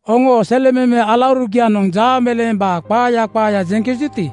Oŋoo selememe alaurugianoŋ jaameleembaa qaaya qaaya jeŋkejuti,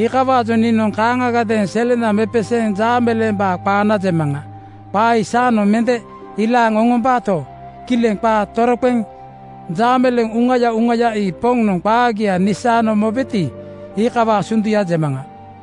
iikawaajoŋ niinoŋ kaaŋagadeeŋ selena mepeseeŋ jaameleembaa qaana jemaŋa. Qaa ii saanoŋ mende ilaaŋ oŋombaato, kileŋ qaa toroqeŋ jaameleeŋ uŋaya uŋaya ii Poŋnoŋ qaagia nisaano mobeti, iikawaa sunduya jemaŋa.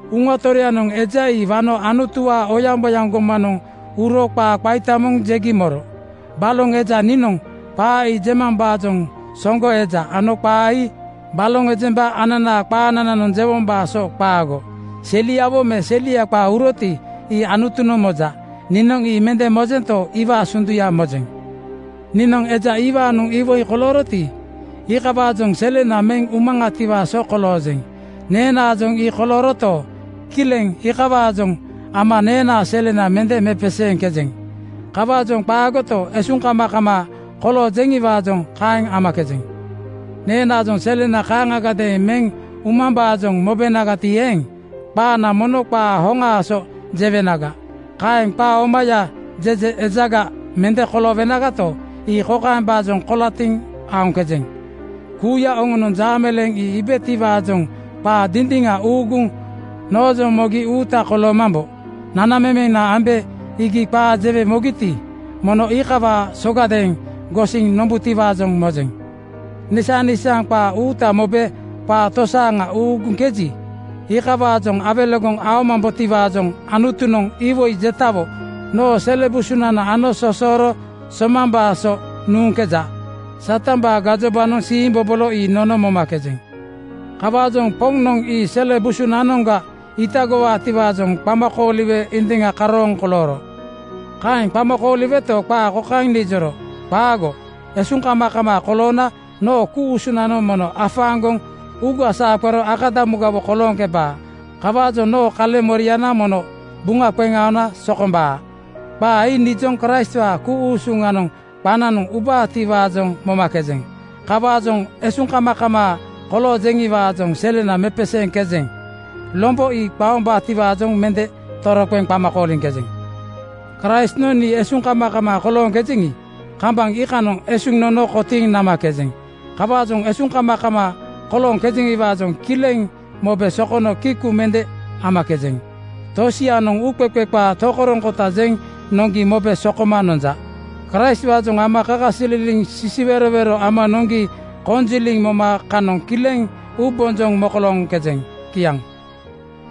Uŋa Toroyanoŋ eja ii wano Anutuwaa oyaŋboyaŋ gomaŋanoŋ uro qaa qaita moŋ jegi moro. Baloŋ eja niinoŋ qaa ii jemambaajoŋ soŋgo eja ano qaa ii baloŋ ejemba ananaa qaanananoŋ jewombaa so qaago. Seliawo me selia qaa uroti, ii Anutunoŋ moja. Niinoŋ ii mende mojento, iwaa sunduya mojeŋ. Niinoŋ eja iwaanoŋ iwoi kolooroti, iikawaajoŋ selena meŋ umaŋatiwaa so koloojeŋ. Neenaajoŋ ii kolooroto, kileŋ iikawaajoŋ ama neenaa selena mende mepeseeŋkejeŋ. Kawaajoŋ qaagoto, esuŋkamakamaa koloojeŋiwaajoŋ kaeŋ amakejeŋ. Neenaajoŋ selena kaaŋagadeeŋ meŋ umambaajoŋ mobenagati eeŋ, qaana mono qaa hoŋaa so jewenaga. Kaeŋ qaa omaya jeje ejaga mende koloowenagato, ii kokaembaajoŋ kolatiŋ aoŋkejeŋ: Kuuya oŋonoŋ jaameleeŋ ii iibetiwaajoŋ qaa dindiŋa uuguŋ noojoŋ mogi uuta koloomambo. Nanamemena ambe iigi qaa jewe mogiti, mono iikawaa sogadeeŋ gosiŋ nombutiwaajoŋ mojeŋ. Nisaŋnisaaŋ qaa uuta mobe qaa tosaaŋa uuguŋkeji, iikawaajoŋ awelegoŋ aomambotiwaajoŋ Anutunoŋ iwoi jetawo noo sele busunanoŋ ano sosoro somambaa so nuŋkeja. Satambaa gajobanoŋ siimbobolo ii nono momakejeŋ. Kawaajoŋ Poŋnoŋ ii sele busunanoŋga itagowaatiwaajoŋ qama kooliwe indiŋa karooŋ kolooro. Kaeŋ qama kooliweto, qaa kokaeŋ nijoro, “Qaago. Esuŋkamakamaa koloona noo ku-usunanoŋ mono afaaŋgoŋ uuga saa qero akadamugawo kolooŋkebaa. Kawaajoŋ noo kaleŋmoriana mono buŋa qeŋ aona sokombaa.” Qaa ii nijoŋ Kraistwaa ku-usuŋanoŋ qananoŋ ubaatiwaajoŋ momakejeŋ. Kawaajoŋ esuŋkamakamaa kolooŋkejeŋiwaajoŋ selena mepeseeŋkejeŋ. Lombo ii qaombaatiwaajoŋ mende toroqeŋ qama kooliŋkejeŋ. Kraistnoŋ nii esuŋkamakamaa kolooŋkejeŋi, kambaŋ iikanoŋ esuŋ nono kotiiŋ namakejeŋ. Kawaajoŋ esuŋkamakamaa koloojeŋiwaajoŋ kileŋ mobe sokono kiku mende amakejeŋ. Tosianoŋ uuqeqe qaa tokoroŋkota jeŋ noŋgi mobe sokoma nonja. Kraistwaajoŋ ama kakasililiŋ sisiwerowero ama noŋgi koŋajiliŋ moma kanoŋ kileŋ uubonjoŋ mokolooŋkejeŋ. Kiaŋ.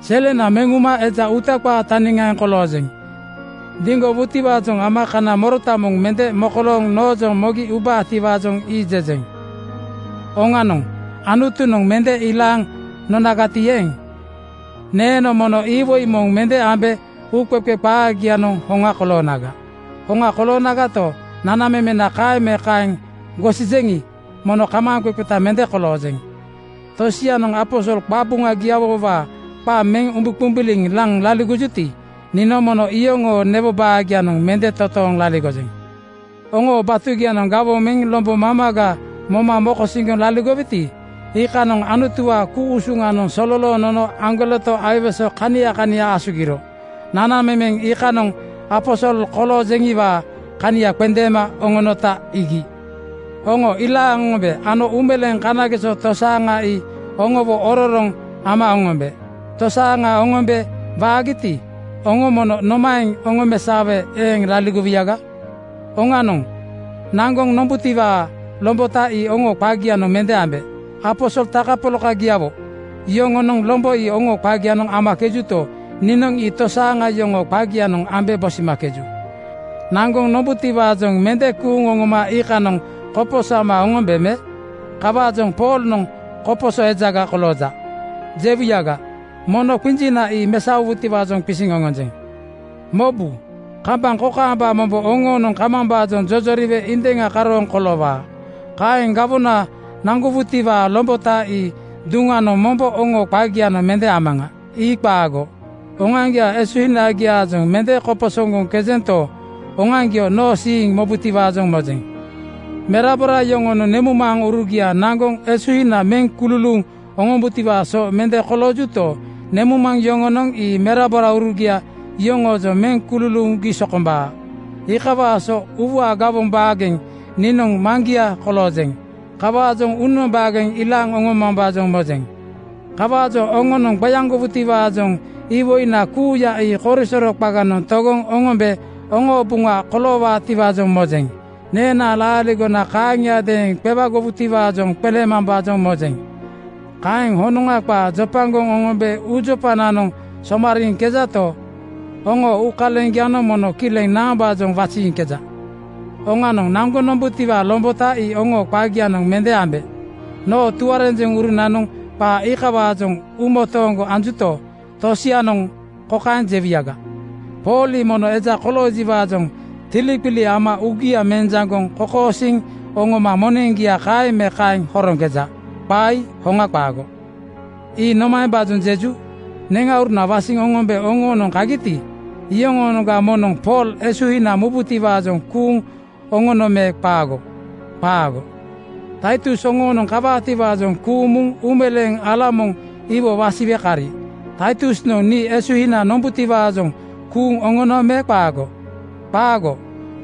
Selena meŋ uma eja uuta qaa taniŋaaŋ koloojeŋ. Diŋgowutiwaajoŋ ama kana morota moŋ mende mokolooŋ noojoŋ mogi ubaatiwaajoŋ ii jejeŋ. Oŋanoŋ, Anutunoŋ mende ilaaŋ nonagati eeŋ, neeno mono iwoi moŋ mende ambe gemaqeqe qaagianoŋ hoŋa koloonaga. Hoŋa koloonagato, nanamemena kaeŋ me kaeŋ gosijeŋi, mono kamaaŋqeqeta mende koloojeŋ. Tosianoŋ aposol qabuŋagiawowaa qa meŋ umbuqumbuliŋ laŋ laligojuti, niinoŋ mono iyoŋoo newo baagianoŋ mende totooŋ laligojeŋ. Oŋoo batugianoŋ gawoŋ meŋ lombo mamaga moma mokosiŋgoŋ laligoweti, iikanoŋ Anutuwaa ku-usuŋanoŋ sololooŋ nono aŋgoleto aiwese kania kania asugiro. Nanamemeŋ iikanoŋ aposol koloojeŋiwaa kania qendeema oŋonota iigi. Oŋo ilaaŋ oŋombe ano uumeleeŋ kanageso tosaaŋa ii oŋowo ororoŋ ama oŋombe. Tosaaŋa oŋombe waagita oŋo mono nomaeŋ oŋomesaowe eeŋ laligowuyaga? Oŋanoŋ, naŋgoŋ nombutiwaa lombota ii oŋoo qagianoŋ mende ambe. Aposol takapolakagiawo yoŋonoŋ lombo ii oŋoo qagianoŋ amakejuto, niinoŋ ii tosaaŋa yoŋoo qagianoŋ ambe bosimakeju. Naŋgoŋ nombutiwaajoŋ mende kuuŋ oŋoma iikanoŋ koposo ama oŋombe me? Kawaajoŋ “Poolnoŋ koposo ejaga kolooja,” jewuyaga, mono qinjina ii mesaowutiwaajoŋ qisiŋ oŋonjeŋ. Mobu, kambaŋ kokaamba mombo oŋoonoŋ kamambaajoŋ jojoriwe indiŋa karooŋ koloowaa. Kaŋ gawona naŋgowutiwaa lombota ii duŋanoŋ mombo oŋoo qagianoŋ mende amaŋa. Ii qaago. Oŋoaŋgiaa esuhinagiaajoŋ mende koposoŋgoŋkejento, oŋoaŋgio noo siiŋ mobutiwaajoŋ mojeŋ. Merabora yoŋonoŋ nemuŋmaŋurugia naŋgoŋ esuhina meŋ kululuuŋ oŋombutiwaa so mende koloojuto, nemuŋmaŋ yoŋonoŋ ii meraboraurugia yoŋoojoŋ meŋ kululuugi sokombaa. Iikawaa so uuwaa gawoŋ baageŋ niinoŋ maŋgia koloojeŋ. Kawaajoŋ uunoŋ baageŋ ilaaŋ oŋomambaajoŋ mojeŋ. Kawaajoŋ oŋonoŋ qeaŋgowutiwaajoŋ iwoina kuuya ii korisoro qaganoŋ togoŋ oŋombe oŋoo buŋa koloowaatiwaajoŋ mojeŋ. Neenaa laaligona kaaŋiadeeŋ qeaŋgowutiwaajoŋ qeleemambaajoŋ mojeŋ Kaeŋ honoŋa qaa jopagoŋ oŋombe uujopananoŋ somariiŋkejato, oŋoo uukaleŋgianoŋ mono kileŋ naambaajoŋ waziiŋkeja? Oŋanoŋ, naŋgoŋ nombutiwaa lombota ii oŋoo qagianoŋ mende ambe. Noo tuarenjeŋurunanoŋ qaa iikawaajoŋ uumotooŋgo anjuto, tosianoŋ kokaeŋ jewuyaga, “Pool ii momo eja koloojiwaajoŋ tiliqili ama uugia mejaŋgoŋ kokosiiŋ oŋoma moneŋgia kaeŋ me kaeŋ horoŋkeja.” Qaa ii hoŋa qaago! Ii nomaembaajoŋ jeju? Neŋauruna wasiŋ oŋombe oŋoonoŋ kagiti, iyoŋoonoŋga moŋnoŋ Pool esuhina mubutiwaajoŋ kuuŋ oŋono me qaago? Qaago. Taitus oŋoonoŋ kawaatiwaajoŋ kuuŋ muŋ uumeleeŋ ala moŋ iwo wasiwe kari. Taitusnoŋ nii esuhina nombutiwaajoŋ kuuŋ oŋono me qaago? Qaago.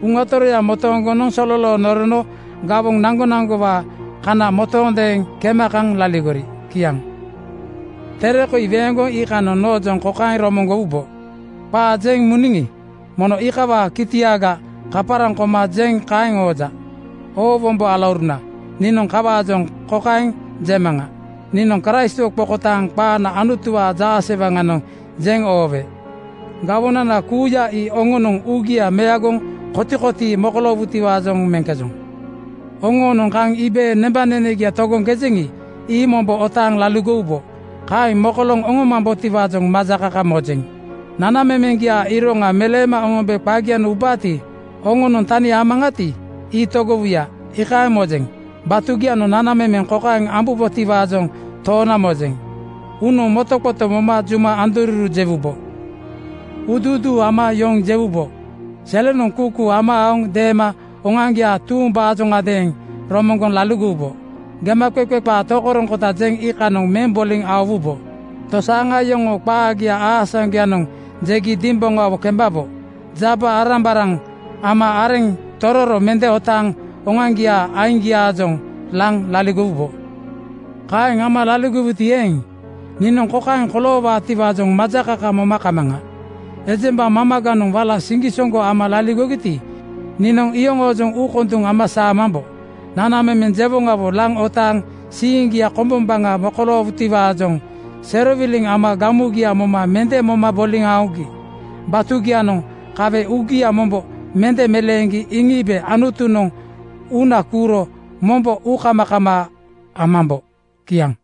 Uŋa Toroya motoongonoŋ mono sololooŋ norono gawoŋ naŋgonaŋgowaa kana motoondeeŋ kema kaŋ laligori. Kiaŋ. Tere koi weeŋgoŋ iikanoŋ noojoŋ kokaeŋ romoŋgowubo, “Qaa jeŋ muniŋi, mono iikawaa kitiaga kaparaŋ koma jeŋ kaeŋ ooja.” Oo wombo alauruna, niinoŋ iikawaajoŋ kokaeŋ jemaŋa: Niinoŋ Kraistwo qokotaaŋ qaana Anutuwaa jaasewaŋanoŋ jeŋ oowe. Gawonana kuuya ii oŋonoŋ uugia meagoŋ kotikotii mokoloowutiwaajoŋ meŋkejoŋ. Oŋoonoŋ kaŋ iibe nanamemeŋgia togoŋkejeŋi, ii mombo otaaŋ laligowubo. Kaeŋ mokolooŋ oŋomambotiwaajoŋ majakaka mojeŋ. Nanamemeŋgiaa iroŋa meleema oŋombe qagianoŋ ubaati, oŋonoŋ tani amaŋati, ii togowuya, iikaeŋ mojeŋ. Batugianoŋ nanamemeŋ kokaeŋ ambubotiwaajoŋ toona mojeŋ: Uunoŋ motoqoto moma juma andoruru jewubo. Uuduuduu ama yoŋ jewubo. Selenoŋ kuukuu ama aoŋ deema oŋoaŋgiaa tuumbaajoŋadeeŋ romoŋgoŋ laligowubo. Gemaqeqe qaa tokoroŋkota jeŋ iikanoŋ meŋ boliŋ aowubo. Tosaaŋa yoŋoo qaagia aasaŋgoyanoŋ jegi dimboŋawo kembabo. Jaba-arambaraŋ ama areŋa tororo mende otaaŋ oŋoaŋgiaa aiŋgianoŋ laŋ laligowubo. Kaeŋ ama laligowuti eeŋ, niinoŋ kokaeŋ koloowaatiwaajoŋ majakaka moma kamaŋa: Ejemba mamaganoŋ wala siŋgisoŋgo ama laligogiti, niinoŋ iyoŋoojoŋ uukonduŋ ama saamambo. Nanamemeŋ jewoŋawo laŋ otaaŋ siiŋgia kombombaŋa mokoloowutiwaajoŋ serowiliŋ ama gamugia moma mende moma boliŋ aogi. Batugianoŋ kawe uugia mombo mende meleeŋgi iŋiibe Anutunoŋ uuna kuuro mombo uukamakamaa amambo. Kiaŋ.